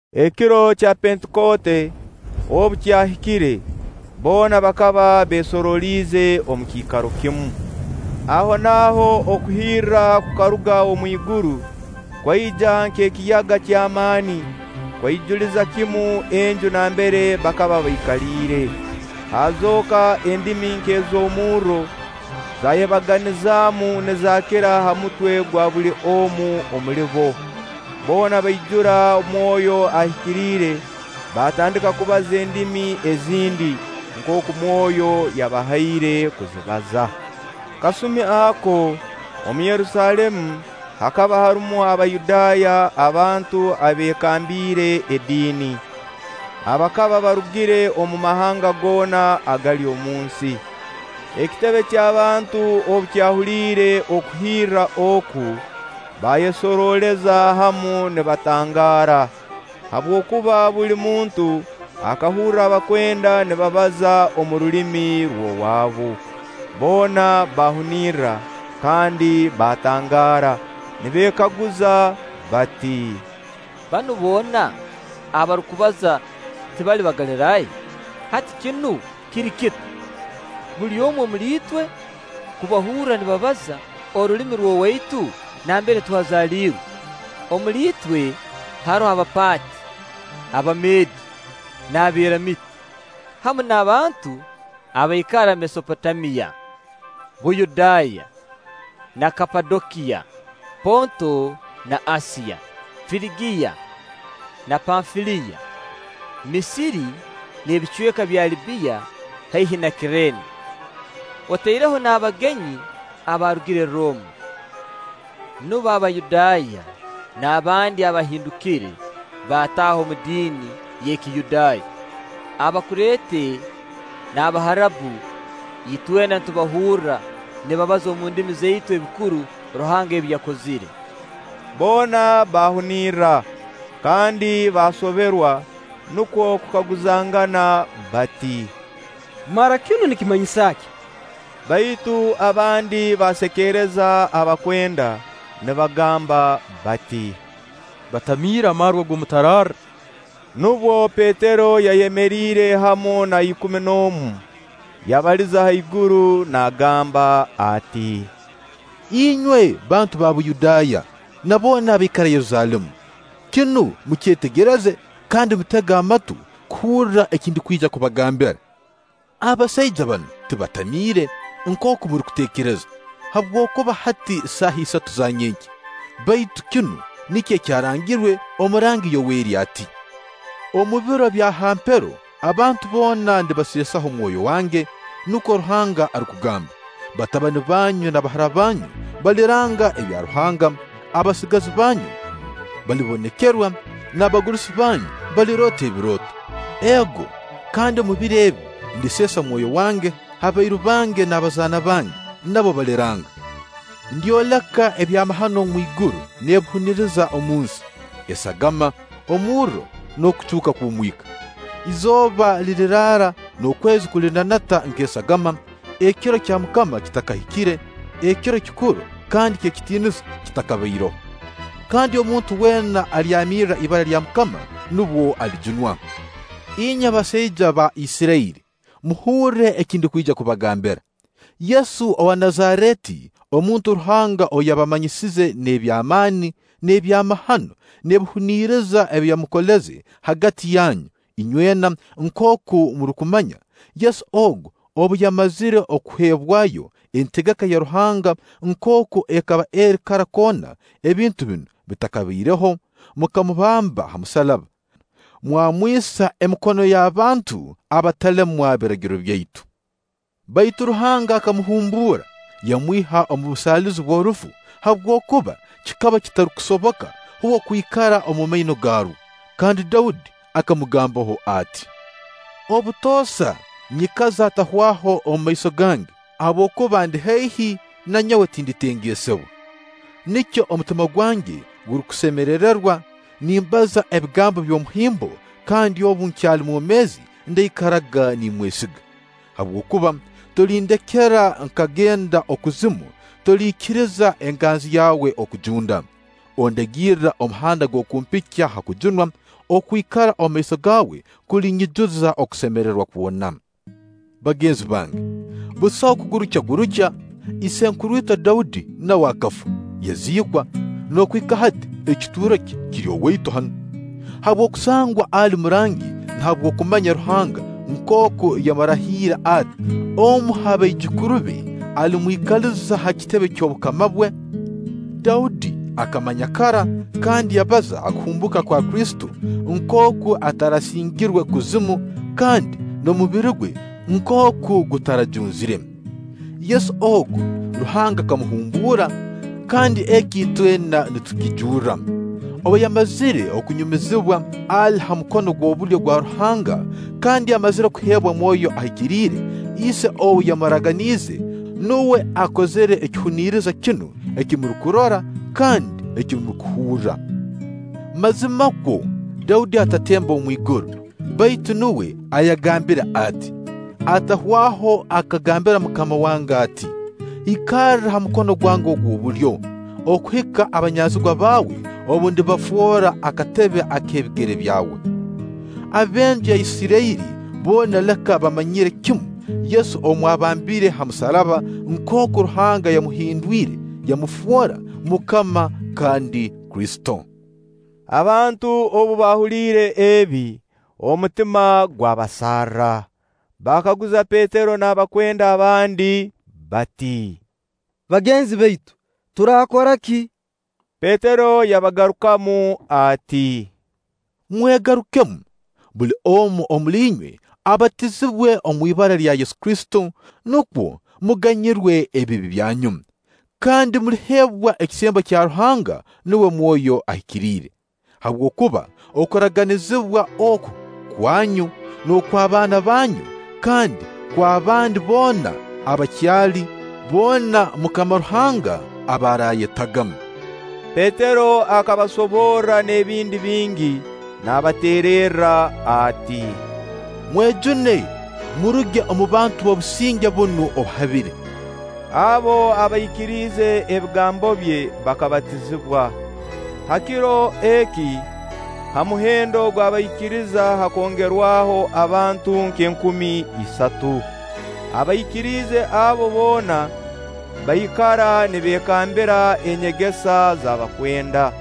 Ekiro kya Pentikooti obu kyahikire, boona bakaba beesoroliize omu kiikaro kimu. Ahonaaho okuhirra kukaruga omu iguru, kwaija nk'ekiyaga ky'amaani, kwaijuliza kimu enju nambere bakaba baikaliire. Haazooka endimi nk'ez'omurro, zayebaganiizemu, nizaakira ha mutwe gwa buli omu omuli bo. Boona baijura Mwoyo Ahikiriire, baatandika kubaza endimi ezindi, nkooku Mwoyo yabahaire kuzibaza. Kasumi ako, omu Yerusaalemu, hakaba harumu Abayudaaya, abantu abeekambiire ediini, abakaba barugire omu mahanga goona agali omu nsi. Ekitebe ky'abantu obu kyahuliire okuhirra oku, baayesorooleza hamu nibatangaara, habwokuba buli muntu akahurra abakwenda nibabaza omu rulimi rw'owaabu. Boona baahunirra kandi baatangaara, nibeekaguza bati; “Banu boona abarukubaza tibali Bagaliraaya? Hati kinu kiri kita, buli omu omuli itwe kubahurra nibabaza orulimi rw'owaitu nambere twazaalirwe? Omuli itwe haroho Abapaati, Abameedi n'Abeeramiiti, hamu n'abantu abaikara Mesopotamiya, Buyudaaya na Kapadokiya, Ponto na Asiya, Firigiya na Panfiliya, Misiri n'ebicweka bya Libbiya haihi na Kirene. Otaireho n'abagenyi abaarugire Rooma, nubo Abayudaaya n'abandi abahindukire bataaha omu diini y'Ekiyudaaya, Abakureete n'Abaharabu. Itwena nitubahurra nibabaza omu ndimi zaitu ebikuru Ruhanga ebi yakozire.” Boona baahunirra kandi baasoberwa, nukwo kukaguzangana bati: “Mara kinu nikimanyisa ki?” Baitu abandi baasekereza abakwenda nibagamba bati: “Batamiire amarwa g'omutararra.” Nubwo Petero yayemeriire hamu na ikumi n'omu, yabaliza haiguru naagamba ati: “Inywe bantu ba Buyudaaya, na boona abaikara Yerusaalemu, kinu mukyetegereze kandi mutege amatu kuhurra eki ndukwija kubagambira. Abasaija banu tibatamiire, nkooku murukuteekereza; habwokuba hati saaha isatu za nyenkya. Baitu kinu nikyo ekyarangirwe omurangi Yoweri ati: ‘Omu biro bya ha mpero abantu boona ndibaseesaho Mwoyo wange.’ Nukwo Ruhanga arukugamba. ‘Batabani banyu na bahara banyu baliranga ebya Ruhanga, abasigazi banyu balibonekerwa, n'abagurusi banyu baliroota ebirooto. Ego, kandi omu biro ebi ndiseesa Mwoyo wange ha bairu bange na ha bazaana bange; nabo baliranga. Ndyoleka ebyamahano omwiguru n'ebihuniriza omunsi: esagama, omurro, n'okucuuka kw'omwika. Izooba liriraara n'okwezi kulinanata nk'esagama, ekiro kya MUKAMA kitakahikire, ekiro kikuru kandi ky'ekitiinisa kitakabaireho. Kandi omuntu weena alyamirra ibara lya MUKAMA nubwo alijunwa.’ “Inywe basaija ba Isirairi, muhurre eki ndukwija kubagambira: Yesu owa Nazareeti, omuntu Ruhanga ou yabamanyisize n'eby'amaani, n'ebyamahano, n'ebihuniriza ebi yamukoleze hagati yanyu, inywena nkooku murukumanya Yesu ogu obu yamazire kuheebwayo, entegeka ya Ruhanga nkooku ekaba eri kara koona ebintu binu bitakabaireho, mukamubamba ha musaraba, mwamwisa emikono y'abantu abatalemwa Biragiro byaitu. Baitu Ruhanga akamuhumbuura, yamwiha omu busaalizi bw'orufu, habwokuba kikaba kitarukusoboka uwe kwikara omumaino garwo. Kandi Daudi akamugambaho ati: ‘Obutoosa nyikaza Atahwaho mu maiso gange, habwokuba andi haihi na nyowe tinditengesebwa. Nikyo omutima gwange gurukusemerererwa, nimbaza ebigambo by'omuhimbo kandi obu nkyali mwomeezi ndaikaraga nimwesiga. Habwokuba tolindekera nkagenda Okuzimu, toliikiriza Enganzi yawe kujunda. Ondagirra omuhanda gw'okumpikya ha kujunwa; okwikara omumaiso gaawe kulinyijuza okusemererwa kwona.’ “Bagenzi bange, busaho kugurukyagurukya: isenkuru itwe Daudi nawe akafa, yaziikwa, n'okuhika hati ekituuro kye kiri owaitu hanu. Habw'okusangwa ali murangi, na habw'okumanya Ruhanga nkooku yamurahiire ati: Omu ha baijukuru be alimwikaliza ha kitebe ky'obukama bwe, Daudi akamanya kara kandi yabaza ha kuhumbuuka kwa Kristo, nkooku atarasingirwe Kuzimu, kandi n'omubiri gwe nkooku gutarajunzire. Yesu ogu, Ruhanga akamuhumbuura; kandi eki itwena nitukijurra. Obu yamazire kunyumizibwa ali ha mukono gw'obulyo gwa Ruhanga kandi amazire kuheebwa Mwoyo Ahikiriire, Ise ou yamuraganiize, nuwe akozire ekihuniriza kinu eki murukurora kandi eki murukuhurra. Mazimakwo Daudi atatembe omu iguru; baitu nuwe ayagambire ati: ‘Atahwaho akangambira MUKAMA wange ati: Ikarra ha mukono gwange ogw'obulyo, okuhika abanyanzigwa baawe obu ndibafoora akatebe ak'ebigere byawe.’ “Ab'enju ya Isirairi boona leka bamanyire kimu Yesu ou mwabambire ha musaraba nkooku Ruhanga yamuhindwire, yamufoora MUKAMA kandi Kristo.” Abantu obu baahuliire ebi, omutima gwabasarra, baakaguza Petero n'abakwenda abandi bati; “Bagenzi baitu, turaakora ki?” Petero yabagarukamu ati; “Mwegarukemu. Buli omu omuli inywe abatizibwe omu ibara lya Yesu Kristo, nukwo muganyirwe ebibi byanyu. Kandi muliheebwa ekisembo kya Ruhanga, nuwe Mwoyo Ahikiriire. Habwokuba okuraganizibwa oku: kwanyu, n'okw'abaana banyu, kandi kw'abandi boona abakyali, boona MUKAMA Ruhanga aba araayetaga.” Petero akabasoborra n'ebindi bingi naabateererra ati: “Mwejune, muruge omu bantu b'obusinge bunu obuhabire.” Abo abaikiriize ebigambo bye bakabatizibwa. Ha kiro eki, ha muhendo gw'abaikiriza hakongerwaho abantu nk'enkumi isatu. Abaikiriza abo boona bakaikara nibeekambira enyegesa z'abakwenda,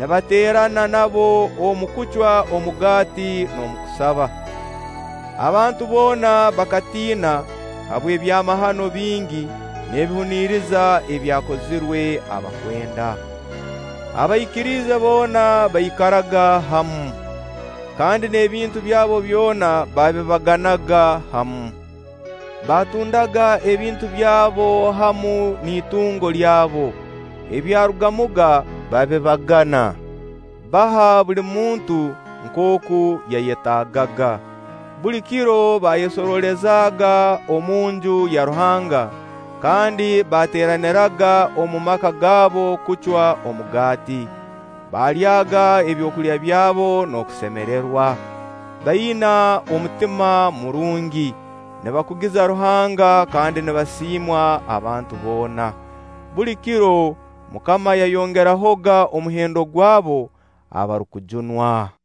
nibateerana nabo omu kucwa omugaati n'omu kusaba. Abantu boona bakatiina habw'ebyamahano bingi n'ebihuniriza ebyakozirwe abakwenda. Abaikiriize boona baikaraga hamu, kandi n'ebintu byabo byona baabibaganaga hamu. Baatundaga ebintu byabo hamu n'itungo lyabo. Ebyarugamuga babibagana, baha buli muntu nkooku yayetaagaga. Buli kiro baayesoroolezaaga omunju ya Ruhanga kandi baateeraniraga mu maka gaabo kucwamu omugaati. Baalyaaga ebyokulya byabo n'okusemererwa, baina omutima murungi, nibakugiza Ruhanga kandi nibasiimwa abantu boona. Buli kiro MUKAMA yayongerahoga omuhendo gw'abo abarukujunwa.